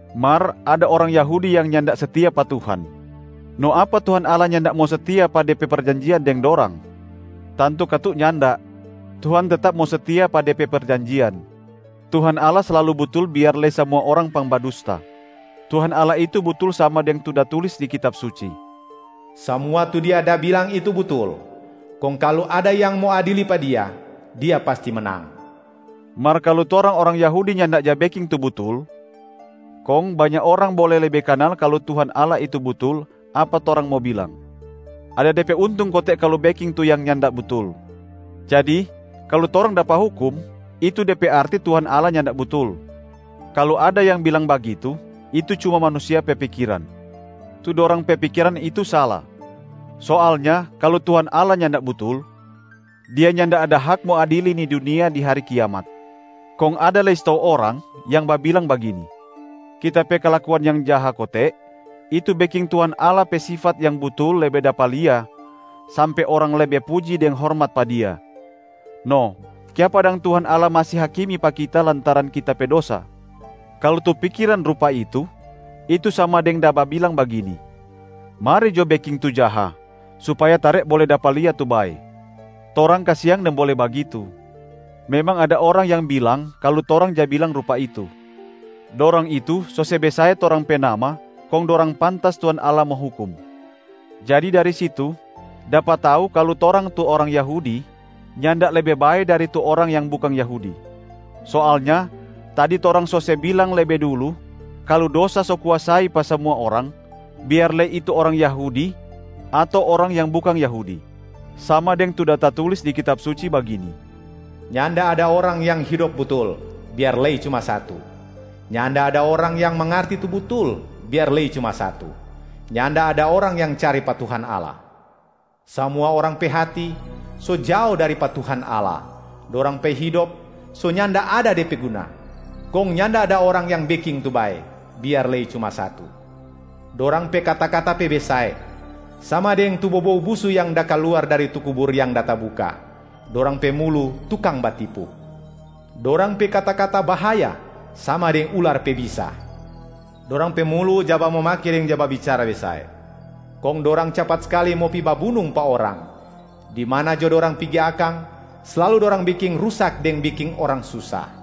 Mar ada orang Yahudi yang nyanda setia pa Tuhan. No apa Tuhan Allah nyanda mo setia pa De pe perjanjian deng dorang? Tantu katu nyanda, Tuhan tetap mo setia pa De pe perjanjian. Tuhan Allah slalu butul biar lei samua orang pangbadusta. Tuhan Allah itu butul sama deng tu da tulis di Kitab Suci, “Samua tu Dia da bilang itu butul, kong kalu ada yang mo adili pa Dia, Dia pasti menang.” Mar kalu torang orang Yahudi nyanda ja beking tu butul, kong banya orang bole lebe kanal kalu Tuhan Allah itu butul, apa torang mo bilang, “Ada de pe untung kote kalu beking tu yang nyanda butul, jadi kalu torang dapa hukum itu de pe arti Tuhan Allah nyanda butul.” Kalu ada yang bilang bagitu, itu cuma manusia pe pikiran. Tu dorang pe pikiran itu sala. Soalnya kalu Tuhan Allah nyanda butul, Dia nyanda ada hak mo adili ni dunia di hari kiamat. Kong ada lei stou orang yang babilang bagini, “Kita pe kalakuan yang jaha kote, itu beking Tuhan Allah pe sifat yang butul lebe dapa lia sampe orang lebe puji deng hormat pa Dia. No kiapa dang Tuhan Allah masi hakimi pa kita lantaran kita pe dosa?” Kalu tu pikiran rupa itu, itu sama deng da babilang bagini, “Mari jo beking tu jaha supaya tare bole dapa lia tu bae!” Torang kasiang nimbole bagitu. Memang ada orang yang bilang kalu torang ja bilang rupa itu. Dorang itu so se besae torang pe nama kong dorang pantas Tuhan Allah mo hukum. Jadi dari situ dapa tau kalu torang tu orang Yahudi nyanda lebe bae dari tu orang yang bukang Yahudi. Soalnya tadi torang so se bilang lebe dulu kalu dosa so kuasai pa samua orang, biar lei itu orang Yahudi ato orang yang bukang Yahudi. Sama deng tu da tatulis di Kitab Suci bagini, “Nyanda ada orang yang hidop butul, biar lei cuma satu. Nyanda ada orang yang mangarti tu butul, biar lei cuma satu. Nyanda ada orang yang cari pa Tuhan Allah. Samua orang pe hati so jao dari pa Tuhan Allah, dorang pe hidop so nyanda ada de pe guna. Kong nyanda ada orang yang beking tu bae, biar lei cuma satu.” “Dorang pe kata-kata pe besae, sama deng tu bobou busu yang da kaluar dari tu kubur yang da tabuka. Dorang pe mulu tukang batipu”. “Dorang pe kata-kata bahaya sama deng ular pe bisa.” “Dorang pe mulu ja bamomake deng ja babicara besae.” “Kong dorang capat skali mo pi babunung pa orang. Di mana jo dorang pigi akang, slalu dorang beking rusak deng beking orang susa.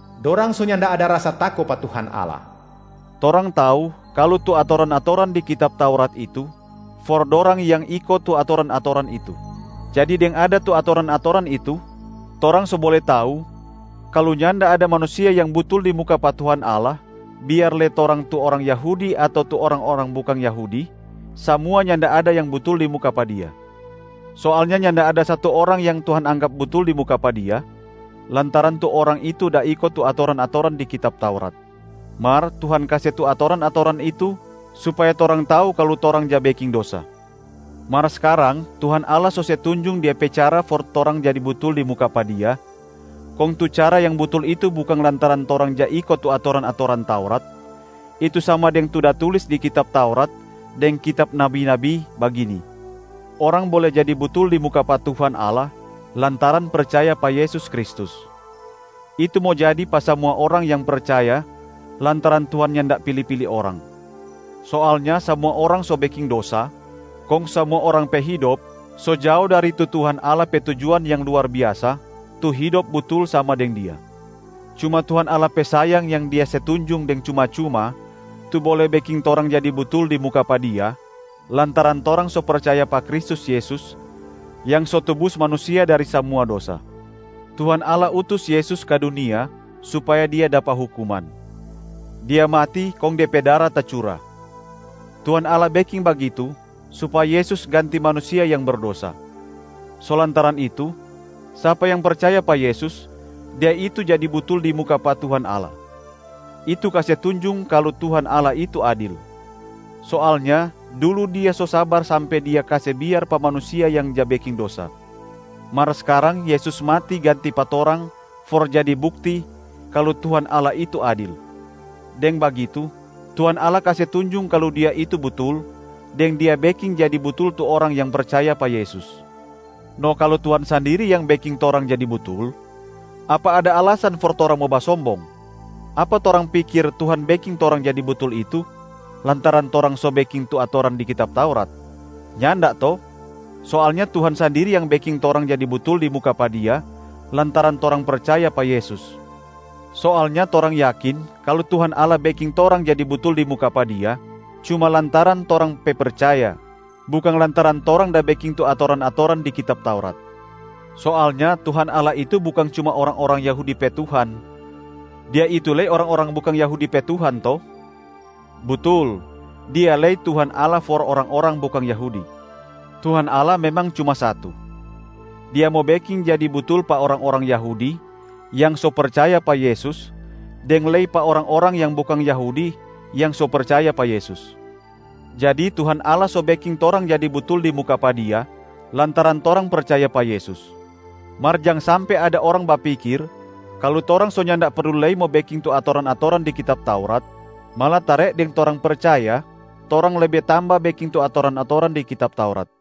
“Dorang so nyanda ada rasa tako pa Tuhan Allah.” Torang tau kalu tu atoran-atoran di kitab Taurat itu for dorang yang iko tu atoran-atoran itu. Jadi deng ada tu atoran-atoran itu, torang so bole tau kalu nyanda ada manusia yang butul di muka pa Tuhan Allah, biar lei torang tu orang Yahudi ato tu orang-orang bukang orang Yahudi, samua nyanda ada yang butul di muka pa Dia. Soalnya nyanda ada satu orang yang Tuhan anggap butul di muka pa Dia lantaran tu orang itu da iko tu atoran-atoran di kitab Taurat. Mar Tuhan kase tu atoran-atoran itu supaya torang tau kalu torang ja beking dosa. Mar skarang, Tuhan Allah so se tunjung Dia pe cara for torang jadi butul di muka pa Dia, kong tu cara yang butul itu bukang lantaran torang ja iko tu atoran-atoran Taurat, itu sama deng tu da tulis di kitab Taurat deng kitab nabi-nabi, bagini: orang bole jadi butul di muka pa Tuhan Allah lantaran percaya pa Yesus Kristus. Itu mo jadi pa samua orang yang percaya lantaran Tuhan nyanda pili-pili orang. Soalnya samua orang so beking dosa, kong samua orang pe hidop so jao dari tu Tuhan Allah pe tujuan yang luar biasa tu hidop butul sama deng Dia. Cuma Tuhan Allah pe sayang yang Dia se tunjung deng cuma-cuma tu bole beking torang jadi butul di muka pa Dia, lantaran torang so percaya pa Kristus Yesus yang so tubus manusia dari samua dosa. Tuhan Allah utus Yesus ka dunia supaya Dia dapa hukuman; Dia mati kong De pe dara tacura. Tuhan Allah beking bagitu supaya Yesus ganti manusia yang berdosa. So lantaran itu, sapa yang percaya pa Yesus, dia itu jadi butul di muka pa Tuhan Allah. Itu kase tunjung kalu Tuhan Allah itu adil. Soalnya dulu Dia so sabar sampe Dia kase biar pa manusia yang ja beking dosa. Mar skarang Yesus mati ganti pa torang for jadi bukti kalu Tuhan Allah itu adil. Deng bagitu Tuhan Allah kase tunjung kalu Dia itu butul, deng Dia beking jadi butul tu orang yang percaya pa Yesus. No kalu Tuhan sandiri yang beking torang jadi butul, apa ada alasan for torang mo basombong? Apa torang pikir Tuhan beking torang jadi butul itu lantaran torang so beking tu atoran di kitab Taurat? Nyanda to? Soalnya Tuhan sandiri yang beking torang jadi butul di muka pa Dia lantaran torang percaya pa Yesus. Soalnya torang yakin kalu Tuhan Allah beking torang jadi butul di muka pa Dia cuma lantaran torang pe percaya, bukang lantaran torang da beking tu atoran-atoran di Kitab Taurat. Soalnya Tuhan Allah itu bukang cuma orang-orang Yahudi pe Tuhan, Dia itu lei orang-orang bukang Yahudi pe Tuhan to? Butul, Dia lei Tuhan Allah for orang-orang bukang Yahudi. Tuhan Allah memang cuma satu. Dia mo beking jadi butul pa orang-orang Yahudi yang so percaya pa Yesus deng lei pa orang-orang yang bukang Yahudi yang so percaya pa Yesus. Jadi Tuhan Allah so beking torang jadi butul di muka pa Dia lantaran torang percaya pa Yesus. Mar jang sampe ada orang bapikir kalu torang so nyanda perlu lei mo beking tu atoran-atoran di kitab Taurat, malatare deng torang percaya torang lebe tamba beking tu atoran-atoran di kitab Taurat.